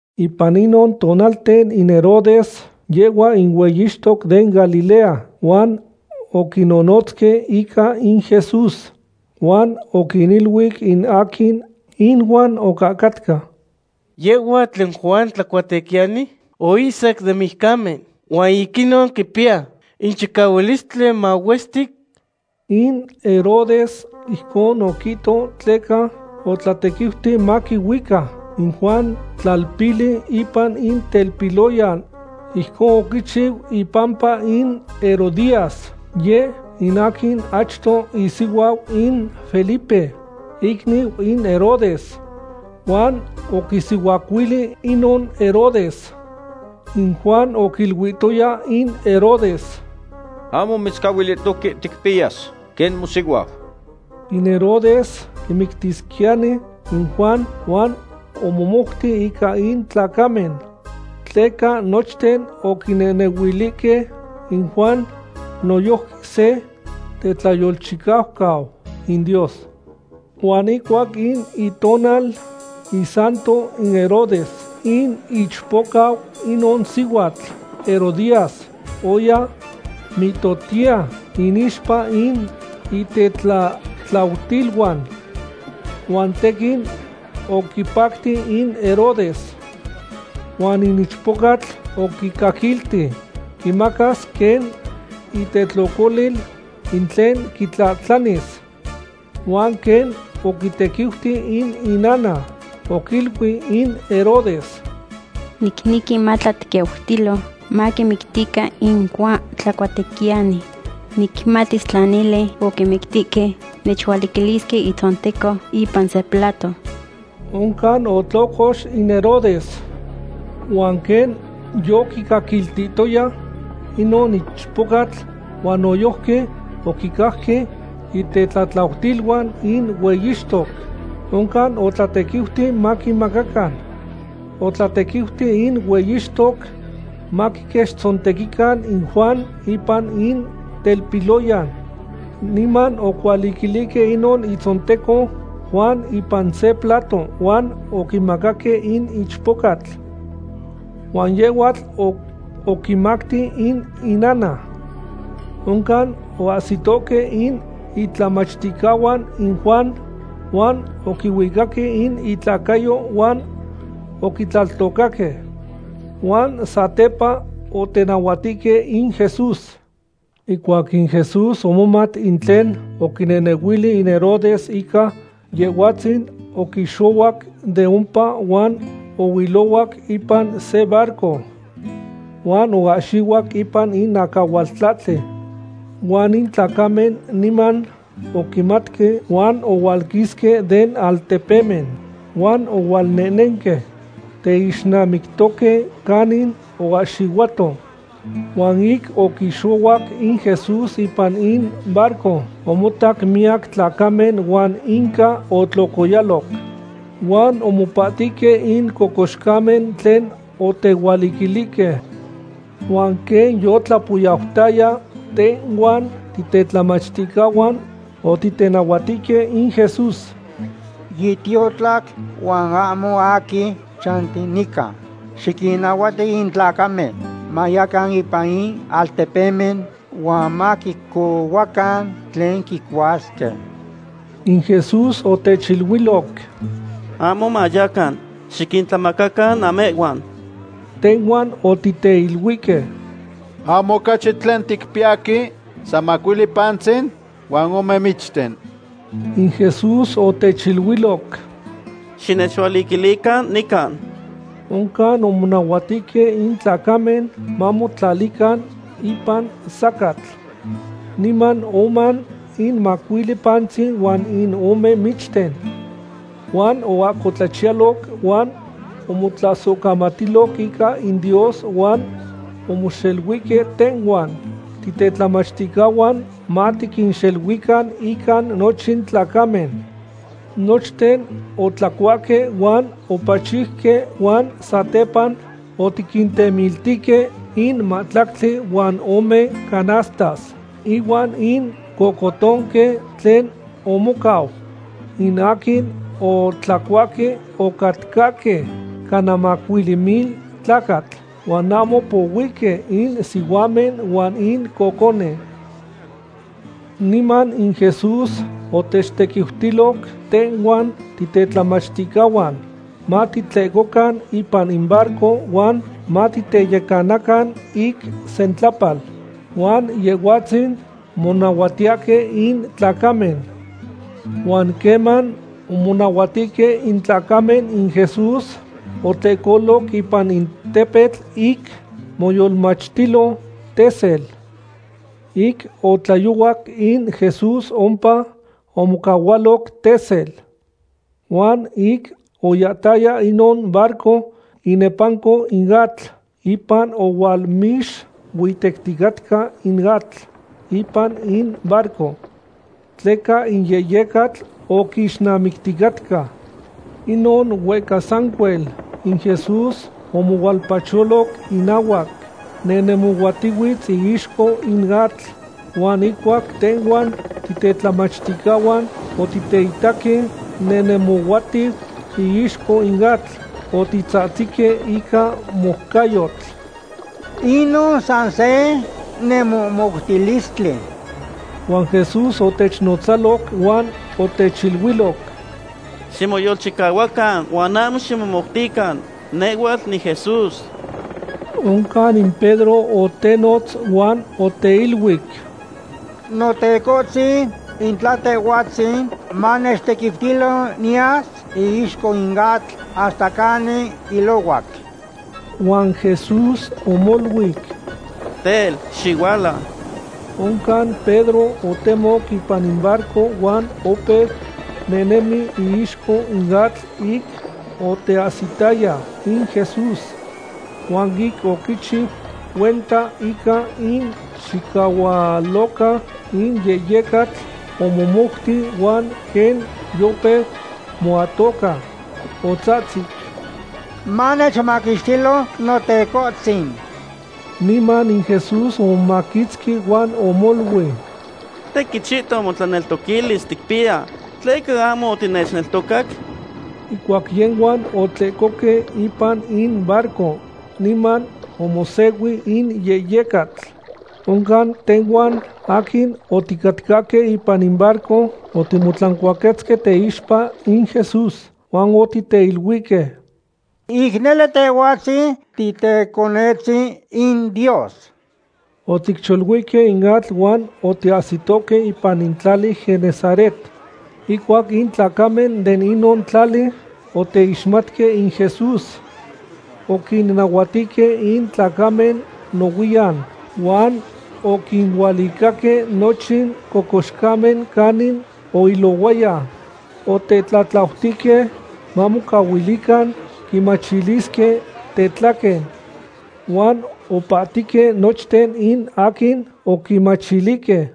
Ipan inon tonalten in Herodes, yehhua in hueyixtoc den Galilea, huan oquinonotzque ica in Jesús. Huan oquiniluic in aquin inuan ocahcatca: ―Yehhuatl in Juan Tlacuatequiyani oihsac den mijcamen, huan ic inon quipiya in chicahualistli mahuestic. In Herodes ijcon oquihto tleca otlatequiuti maquihuicac in Juan tlalpili ipan in telpiloyan. Ijcon oquichiu ipampa in Herodías, yeh in aquin achto isihuau in Felipe, icniu in Herodes. Huan oquisihuacuili inon Herodes. In Juan oquiluihtoya in Herodes: ―Ahmo mitzcahuilihtoque ticpiyas quen mosihuau. In Herodes quimictisquiyani in Juan, huan omomouti ica in tlacamen. Tleca nochten oquinehnehuilihque in Juan noyojqui se tetlayolchicaucau in Dios. Huan ihcuac in itonal isanto in Herodes, in ichpocau inon sihuatl Herodías oya mihtohtiya inixpa in itetlatlautiluan, huan tequin oquipacti in Herodes. Huan in ichpocatl oquicaquilti quimacas quen itetlocolil in tlen quitlahtlanilis. Huan quen oquitequiuti in inana, oquiluic in Herodes: ―Nicnequi matlatequiutilo maquimictican in Juan Tlacuatequiyani. Nicmatis tla nele oquimictihque, nechualiquilisque itzonteco ipan se plato. Oncan otlocox in Herodes, huan quen yoquicaquiltihtoya inon ichpocatl huan noyojqui oquicajque itetlatlautiluan in hueyixtoc, oncan otlatequiuti maquimacacan. Otlatequiuti in hueyixtoc maquiquechtzontequican in Juan ipan in telpiloyan. Niman ocualiquilihque inon itzonteco Juan ipan se plato huan oquimacaque in ichpocatl. Huan yehhuatl oquimacti in inana. Oncan oahsitohque in itlamachticahuan in Juan huan oquihuicaque in itlacayo huan oquitlaltocaque. Huan satepa otenahuatihque in Jesús. Ihcuac in Jesús omomat in tlen oquinehnehuili in Herodes ica Yehhuatzin, oquixohuac de ompa huan ohuilohuac ipan se barco. Huan oahxihuac ipan in acahualtlahtli. Huan in tlacamen niman oquimatque huan ohualquisque den altepemen huan ohualnehnenque teixnamiquitohque canin oahxihuato. Huan ic oquixohuac in Jesús ipan in barco, omotac miyac tlacamen huan inca otlocoyaloc. Huan omopahtihque in cocoxcamen tlen otehualiquilihque. Huan quen yotlapoyautaya, tehhuan titetlamachticahuan otitenahuatihque in Jesús: ―Yitiotlac huan ahmo aquin chanti nican. Xiquinnahuati in tlacamen mayacan ipan in altepemen huan maquicohuacan tlen quicuasque. In Jesús otechiluiloc: ―Ahmo mayacan. Xiquintlamacacan namehhuan. Tehhuan otiteiluihque: ―Ahmo ocachi tlen ticpiyahque san macuili pantzin huan ome michten. In Jesús otechiluiloc: ―Xinechualiquilican nican. Oncan omonahuatihque in tlacamen mamotlalican ipan sacatl. Niman omoan in macuili pantzin huan in ome michten. Huan oahcotlachiyaloc huan omotlasohcamatiloc ica in Dios huan omoxeluihque tehhuan titetlamachticahuan matiquinxeluican ica nochin tlacamen. Nochten otlacuahque huan opachiuque huan satepa otiquintemiltihque in mahtlactli huan ome canastas ihuan in cohcotonque tlen omocau. In aquin otlacuahque ocatcahque cana macuili mil tlacatl, huan ahmo pohuihque in sihuamen huan in cocone. Niman in Jesús otechtequiutiloc tehhuan titetlamachticahuan matitlehcocan ipan in barco huan matiteyecanacan ic sentlapal, huan Yehhuatzin monahuatiyahque in tlacamen. Huan queman omonahuatihque in tlacamen, in Jesús otlehcoloc ipan in tepetl ic moyolmachtilo tesel. Ic otlayohuac in Jesús ompa omocahualoc tesel. Huan ic oyahtaya inon barco inepanco in atl, ipan ohualmixuitecticatca in atl ipan in barco, tleca in yehyecatl oquixnamicticatca. Inon huehca sancuel, in Jesús omohualpacholoc inahuac, nehnemohuatihuitz iixco in atl. Huan ihcuac tehhuan titetlamachticahuan otiteitaque nehnemohuatiu iixco in atl, otitzahtzihque ica moucayotl: ―Inon san se nemohmoutilistli. Huan Jesús otechnotzalo huan otechiluiloc: ―¡Ximoyolchichuacan huan ahmo ximomoutican! Nehhuatl niJesús. Oncan in Pedro otenotz huan oteiluic: ―Notecohtzin, in tla Tehhuatzin, manechtequiutilo niyas iixco in atl hasta canin ilohuac. Huan Jesús omoluic: ―Tel, xihualau. Oncan Pedro otemoc ipan in barco huan opeu nehnemi iixco in atl ic oteahsitaya in Jesús. Huan ic oquichiu cuenta ica in chicahualoca in yehyecatl, omomouti, huan quen yopeu moatoca, otzahtzic: ―¡Manechmaquixtilo, Notecohtzin! Niman in Jesús omomaquitzqui huan omoluic: ―¡Tequin chihton motlaneltoquilis ticpiya! ¿Tleca ahmo otinechneltocac? Ihcuac yehhuan otlehcohque ipan in barco niman omosehui in yehyecatl. Oncan tehhuan aquin oticatcahque ipan in barco otimotlancuaquetzque teixpa in Jesús huan otiteiluihque: ―Ic nele Tehhuatzin tiTeconetzin in Dios. Oticcholuihque in atl huan otiahsitohque ipan in tlali Genesaret. Ihcuac in tlacamen de inon tlali oteixmatque in Jesús, oquinnahuatihque in tlacamen nohuiyan, huan oquinualicaque nochin cocoxcamen canin oilohuaya. Otetlatlautihque mamocahuilican quimachilisque tetlaquen. Huan opahtihque nochten in aquin oquimachilihque.